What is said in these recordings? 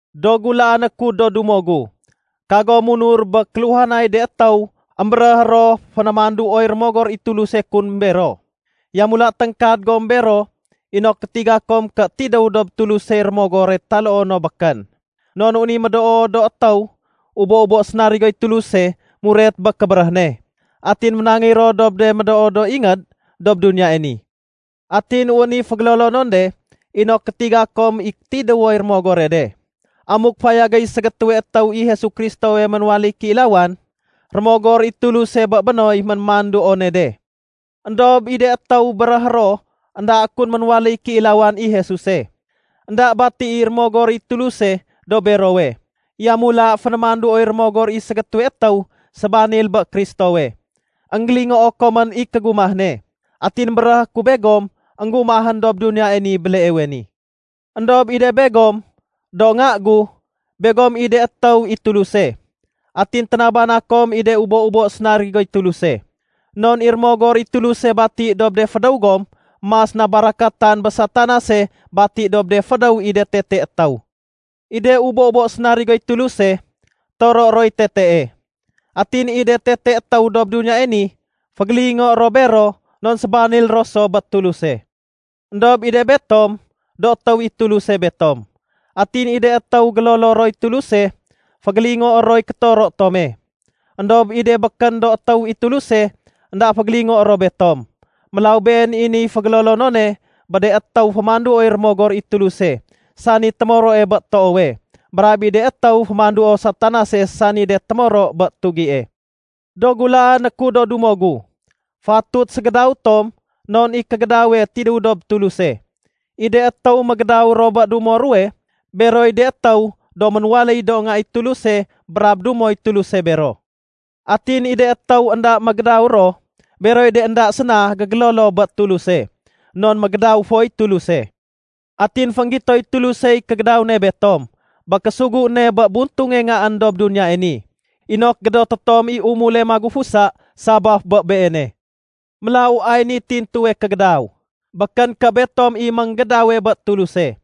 Do gulaané ku do dumo gu, kagom munur bé kéluhanay de étéw émbéréh ro fénémanduoy Rémogor i Tuluse kun bero. Yamula téngkad gom bero inok gétiga kom ké tidéw dob Tulusey rémogore taloo no békén. Non wén i médoo do étéw ubo-ubo sénarigoy Tuluse muret bé kébéréh ne, atin ménangéy ro dob de médoo do ingéd dob duniyae ni. Atin wén i fégélolonon de inok gétiga kom i tidéwoy rémogore de. Amuk fayagéy ségétéwe étéw i Jesu Kristowe ménwaléy kéilawan, Rémogor i Tuluse bé bénoy ménémanduone de. Endob i de étéw béréhé ro énda kun ménwaléy kéilawan i Jesuse, énda bati i Rémogor i Tuluse dob berowe. Yamula fénémanduoy rémogor i Ségétéwe étéw Sébanil bé Kristowe. Enggélingoo komén i kégumah ne, atin béréhé ku begom énggumahén dob duniyae ni béleewe ni. Endob i de begom, do nga gu, begom i de étéw i Tuluse. Atin ténabana kom i de ubo-ubo sénarigoy Tuluse. Non i Rémogor i Tuluse bati dob de fédéw gom mas na barakatan bé Satanase bati dob de fédéw i de tete étéw. I de ubo-ubo sénarigoy Tuluse, toroé roy tetee. Atin i de tete étéw dob duniyae ni fégélingoé ro bero non sébanil ro so bé Tuluse. Endob i de betom, do étéw i Tuluse betom. Atin i de étéw gélolo roy Tuluse, fégélingoé roy kétoro tome. Endob i de békén do étéw i Tuluse, énda fégélingoé ro betom. Mélaw been i niy fégélolonone bé de étéw fémanduoy Rémogor i Tuluse sani témoroe bé toowe, brab i de étéw fémanduo Satanase sani de témoro bé tugie. Do gulaané ku do dumo gu, fatut ségédaw tom non i kégédawe tidéw dob Tuluse. I de étéw mégédaw ro bé dumo ruwe, beroy de étéw do ménwaléy do nga i Tuluse brab dumoy Tuluse bero. Atin i de étéw énda mégédaw ro, beroy de énda séna gégélolo bé Tuluse, non mégédaw foy Tuluse. Atin fénggitoy Tulusey kégédaw ne betom bé késugu ne bé buntunge Ngaén dob duniyae ni inok gédoté tom i umule magufusa sabaf bé Beene. Mélaw ay niy tintuwe kégédaw: Békén ké betom i ménggédawe bé Tuluse.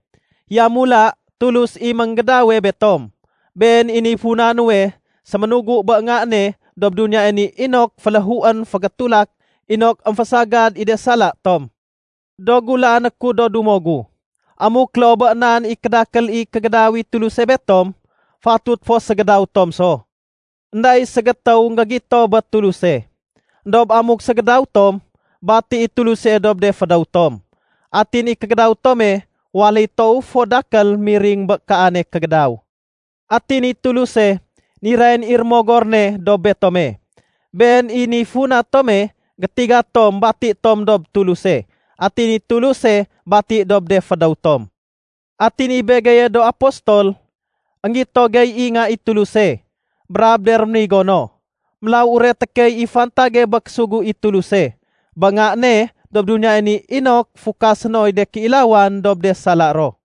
Yamula, Tulus i ménggédawe betom. Been i niy funa nuwe séménugu bé Nga ne dob duniyae ni inok féléhuén fégétulak inok émfésagad i de sala tom. Do gulaané ku do dumo gu, amuk loo bé nan i kédakél i kégédaw i Tuluse betom, fatut fo ségédaw tom so. Enda i ségétéw énggégito bé Tuluse. Endob amuk ségédaw tom, bati i Tuluse dob de fédéw tom, atin i kégédaw tome waléy toow fo dakél miring bé kaane kégédaw. Atin i Tuluse nirayén i Rémogor ne dob betome. Been i niy funa tome gétiga tom bati tom dob Tuluse atin i Tuluse bati dob de fédéw tom. Atin i begeye do apostol, énggito gey i Nga i Tuluse brab de rénigo no. Mélaw ureté key i fantage bé késugu i Tuluse bé Nga ne dob duniyae ni inok fukasé noy de kéilawan dob de sala ro.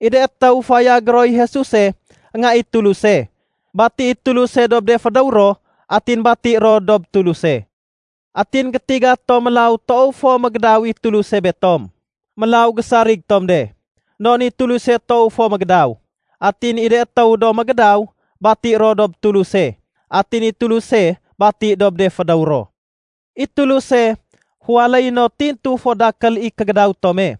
I de étéw fayagé roy Jesuse Nga i Tuluse, bati i Tuluse dob de fédéw ro, atin bati ro dob Tuluse. Atin gétiga tom mélaw toow fo mégédaw i Tuluse betom. Mélaw gésarig tom de. Non i Tuluse toow fo mégédaw. Atin i de étéw do mégédaw, bati ro dob Tuluse atin i Tuluse bati dob de fédéw ro. I Tuluse féwaléyé no tintu fo dakél i kégédaw tome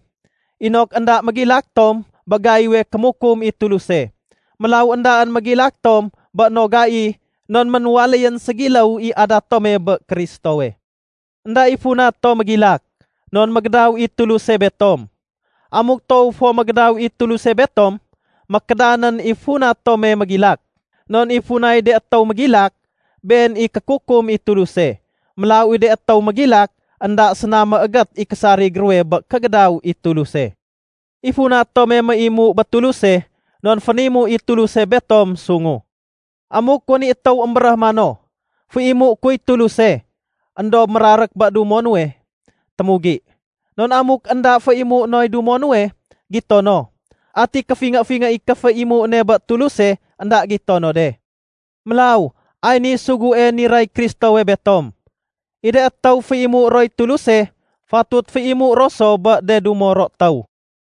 inok énda mégilak tom bé gaiwe kémukum i Tuluse. Mélaw éndaén mégilak tom bé no gai, non ménwaléyén ségiléw i adat tome bé Kristowe. Enda i funa tom mégilak non mégédaw i Tuluse betom. Amuk toow fo mégédaw i Tuluse betom, mékédanén i funa tome mégilak. Non i funay de étéw mégilak, been i kékukum i Tuluse. Mélaw i de étéw mégilak, énda séna méégét i késarig ruwe bé kégédaw i Tuluse. I funa tome méimu bé Tuluse non fénimu i Tuluse betom sungu. Amuk wén i étéw émbéréh mano, “Féimué kuy Tuluse”, éndob mérarék bé dumo nuwe, témugi. Non amuk énda féimué noy dumo nuwe gito no, ati kéfingé-fingé i kéféimu ne bé Tuluse énda gito no de? Mélaw ay niy sugue niray Kristowe betom: I de étéw féimué roy Tuluse, fatut féimu ro so bé de dumo ro étéw.